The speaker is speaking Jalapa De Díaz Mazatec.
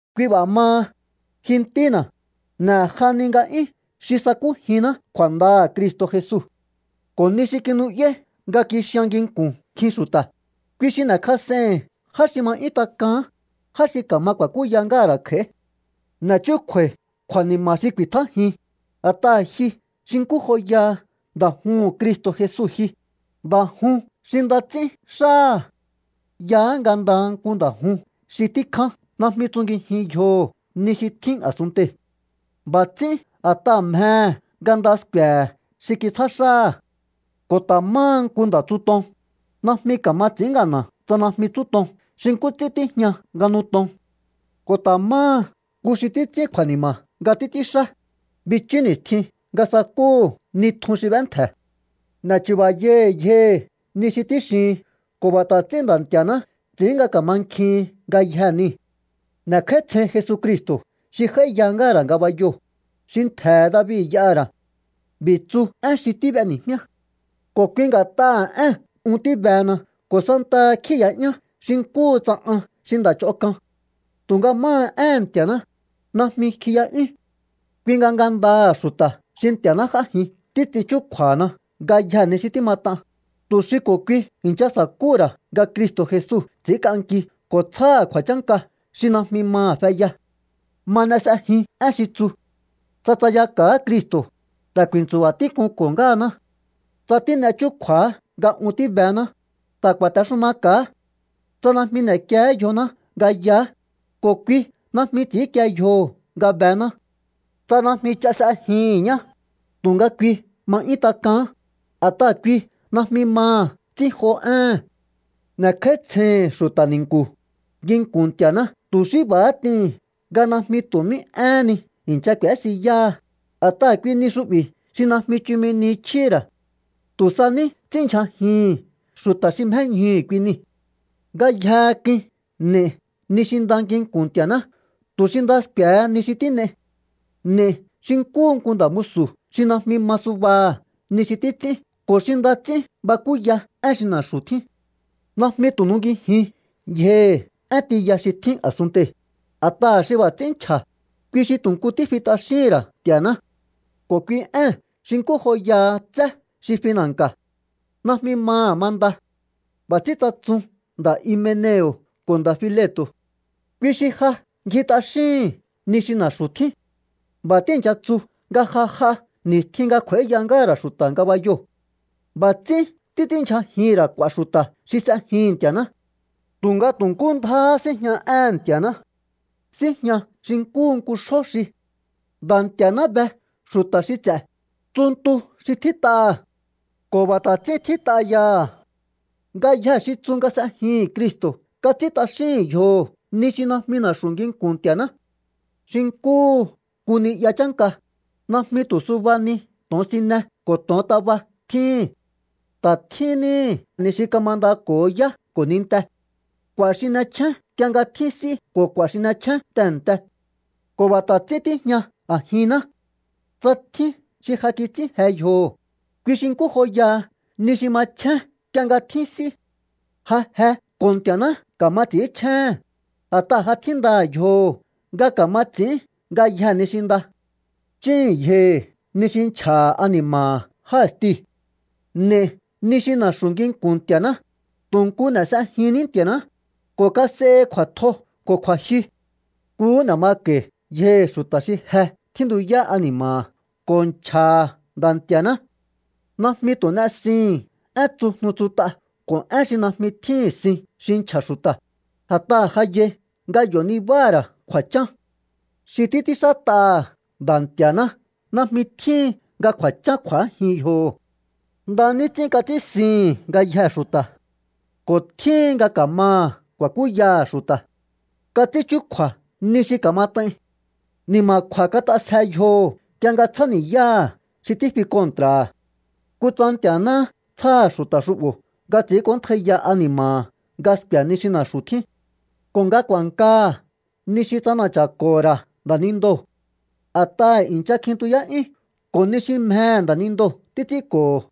Kui b'a̱ maha, ji ntína̱, n'e̱jahani nga'yún xi sakújinná kju̱a̱ndaha̱ Cristo̱ Jesu. Ko̱ ni xi kinu'yáí nga kixian nginku̱n nkjin xu̱ta̱, kui xi n'e̱kjas'eihi̱n já xi ma 'yún tak'aán, já xi ka̱ma ku̱a̱kúya ngáha̱ ra̱ kj'a̱í. N'e̱ chúkju̱a̱i̱ kju̱a̱ni̱ma̱ xi ku̱i̱tjájin, a̱t'aha̱ ji xi nkú joya nda̱ juhu̱n Cristo̱ Jesu ji, nda̱ jun xi nda ts'ín xáha̱. Yaá nga ndaha nku nda̱ jun xi tíkján najmi tsungijin yjoho̱ ni xi tjín a̱sunntei̱. B'a̱ ts'ín a̱t'aha̱ mjehe̱ nga nda sku̱e̱he̱ xi kitsjá xáha̱. Ko̱ ta̱ máha nku nda̱tsuton, najmi ka̱ma ts'i̱ín ngana̱ tsa najmi tsúton xi nkú ts'ín tíjña nga nuton. Ko̱ ta̱ máha nku xi títs'ín kju̱a̱ni̱ma̱ nga títs'ínxá, bichú ni̱stjin nga sakúhu̱ ni tjun xi b'éntje̱. N'e̱chu̱ba̱yahi̱ yjohi̱ ni xi tíxihin ko̱ b'a̱ ta̱ ts'ín Nda̱ Nti̱a̱ná ts'i̱ín nga ka̱mankjihin ngayjee̱ nii̱. N'e̱kj'áítsjein Jesucristo̱ xi j'áíya ngáha̱ ra̱ ngabayoo̱, xi ntje̱he̱ David y'aha̱ ra̱. B'i̱ tsu én xi tíb'eni̱jmíá. Ko̱ kui nga̱t'aha̱ ée̱n un tíbehena ko̱ santaha kjíi̱ya'yán xi nkúhu tsa an xi nda̱ ch'on k'an. Tu̱nga máha éhe̱n Nti̱a̱ná, najmi kjiya'yún. Kui nga ngandaha̱ xu̱ta̱ xi Nti̱a̱ná j'ájin títs'in chúkju̱a̱hana ngayjee̱ ni xi tímat'an, tu̱ xi ko̱ kui i̱ncha sa̱kúhu̱ ra̱ nga Cristo̱ Jesu ts'i̱ínk'anki ko̱ tsjáha̱ kju̱a̱chánka xi najmi maha̱ feya. Ma n'e s'ejin én xi tsu: Tsa tsayaka̱á Cristo̱, ta̱ ku̱i̱ntsu̱ba̱ tík'unko̱ ngáhaná. Tsa tín'e chúkju̱á nga un tíbená, ta̱ ku̱a̱texumaka̱á. Tsa najmi n'e̱kié yjoná nga yaá, ko̱ kui najmi ts'i̱ínkie yjoho̱ nga bená. Tsa najmi ch'a s'ejihi̱n ñá, tu̱nga kui ma ma 'yún tak'aán, a̱t'aha̱ kui najmi maha̱ ts'ínjo éhe̱n. N'e̱kj'áítsjeihi̱n xu̱ta̱ ni̱nku̱, nginku̱n Nti̱a̱ná tu̱ xí b'a̱há t'ihi̱n, nga najmi tu̱ mí éhen ni i̱ncha k'u̱ésiyáha, a̱t'aha̱ kui ni xu'bi̱ xi najmi chumi ni chjíhi̱ ra̱. Tu̱ sa ní ts'ínndyjajihi̱n xu̱ta̱ xi mjéñjuhu̱ kui niu̱. Ngayjehe k'uin n'e̱i ni xi nda nginku̱n Nti̱a̱ná tu̱ xi nda sku̱e̱he ni xi tín'ei. N'e̱i xi nkúhu nku nda̱ musu̱ xi najmi ma subaha̱ ni xi títs'ín ko̱ xi nda ts'ín bakúya én xi na̱xu̱ tjín. Najmi tu̱ nungijin yjohi̱ én tiya xi tjín a̱sunntei̱, a̱t'aha̱ xi b'a̱ ts'ín nchja̱, kui xi tu̱ nku fi t'axíhín ra̱ Nti̱a̱ná. Ko̱ kui éhe̱n xi nkú joyaha tsé xi fina̱nka̱. Najmi maha̱ manda. B'a̱ ts'ín tsatsun nda̱ Himeneo̱ ko̱ nda̱ Fileto̱. Kui xi ja ngji t'axíhi̱n ni xi na̱xu̱ tjín. B'a̱ tíi̱ncha tsu nga ja j'a ni̱stjin nga kj'u̱a̱íya ngáha̱ ra̱ xu̱ta̱ ngabayoo̱. B'a̱ ts'ín títs'ínndyjajihi̱n ra̱ k'u̱a̱ xu̱ta̱ xi s'ejihi̱n Nti̱a̱ná. Tu̱nga tu̱ nkú ndjáhá síjña éhe̱n Nti̱a̱ná. Síjña xi nkúhu nku xjó xi: “Nda̱ Nti̱a̱ná be xu̱ta̱ xi ts'e̱”, tsu ntu xi tjít'aha̱. Ko̱ b'a̱ ta̱ ts'ín tjít'a yaha̱: “Ngayjee̱ xi tsu nga s'ejihi̱n Cristo̱ kats'ín t'axíhi̱n yjoho̱ ni xi najmi na̱xu̱ nginku̱n Nti̱a̱ná.” Xi nkúhu nku ni'ya chánka, najmi tu̱ suba ni to̱onsine ko̱ to̱ontaba tjíhi̱n. Ta̱ tjín níhi̱ ni xi kamandako̱ho yá ko̱ ninte. K'u̱a̱ xi n'echjén nk'ie nga tjín s'í ko̱ k'u̱a̱ xi n'echjén tehe̱nte. Ko̱ b'a̱ ta̱ ts'ín tíjña a̱jinná. Tsa tjín xi ja kits'ín je yjoho̱, kui xi nkú joyaha ni xi ma n'echjén nk'ie nga tjín s'í. Ja je ko̱ Nti̱a̱ná ka̱ma ts'i̱ínchjéhe̱n, a̱t'aha̱ ja tjíndaha̱ yjoho̱ nga ka̱ma ts'i̱ín ngayjee̱ ni xi nda. Chíhi̱n yjohi̱ ni xi nchja̱ha̱ ani̱ma̱ha̱ já i̱stiu̱. N'e̱i ni xi na̱xu̱ nginku̱n Nti̱a̱ná, tu̱ nku n'e̱ s'ejinní Nti̱a̱ná, ko̱ kas'ehi kju̱a̱tjo ko̱ kju̱a̱jyu. Nkuhú n'e̱ mako̱i̱ yjohi̱ xu̱ta̱ xi je tjíntuyá ani̱ma̱ha̱ ko̱ nchja̱ha̱ Nda̱ Nti̱a̱ná. Najmi tu̱ n'esihi̱n én tsujnu tsut'a ko̱ én xi najmi tjíhi̱n sin xi nchja̱ xu̱ta̱, a̱t'aha̱ ja yai nga yo̱ nibáha̱ ra̱ kju̱a̱chán. Xi títs'ínxát'aha̱ Nda̱ Nti̱a̱ná najmi tjíhin nga kju̱a̱chán kju̱ájin yjoho̱. Nda ní ts'ín kats'ínsihi̱n ngayjee̱ xu̱ta̱. Ko̱ tjíhin nga ka̱maha̱ ku̱a̱kúyaha̱ xu̱ta̱. Kats'ín chúkju̱a̱ ni xi ka̱mat'ain. Ni̱ma̱kju̱a̱ kat'asje yjoho̱ nk'ie nga tsjáni̱yáha̱ xi tífi kontra̱ha̱. Kutsa Nti̱a̱náhá tsjáha̱ xu̱ta̱ xu'bo̱ nga ts'i̱ínk'óntjaiya ani̱ma̱ha̱ nga sku̱e̱ ni xi na̱xu̱ tjín ko̱ nga ku̱a̱nkaha̱ ni xi ts'ana̱cha̱ko̱ho̱ ra̱ nda̱nindoo̱. A̱t'aha̱ i̱ncha kjintuyá'yún ko̱ ni xi mjehe̱ nda̱nindoo̱ títs'ínko̱ho̱.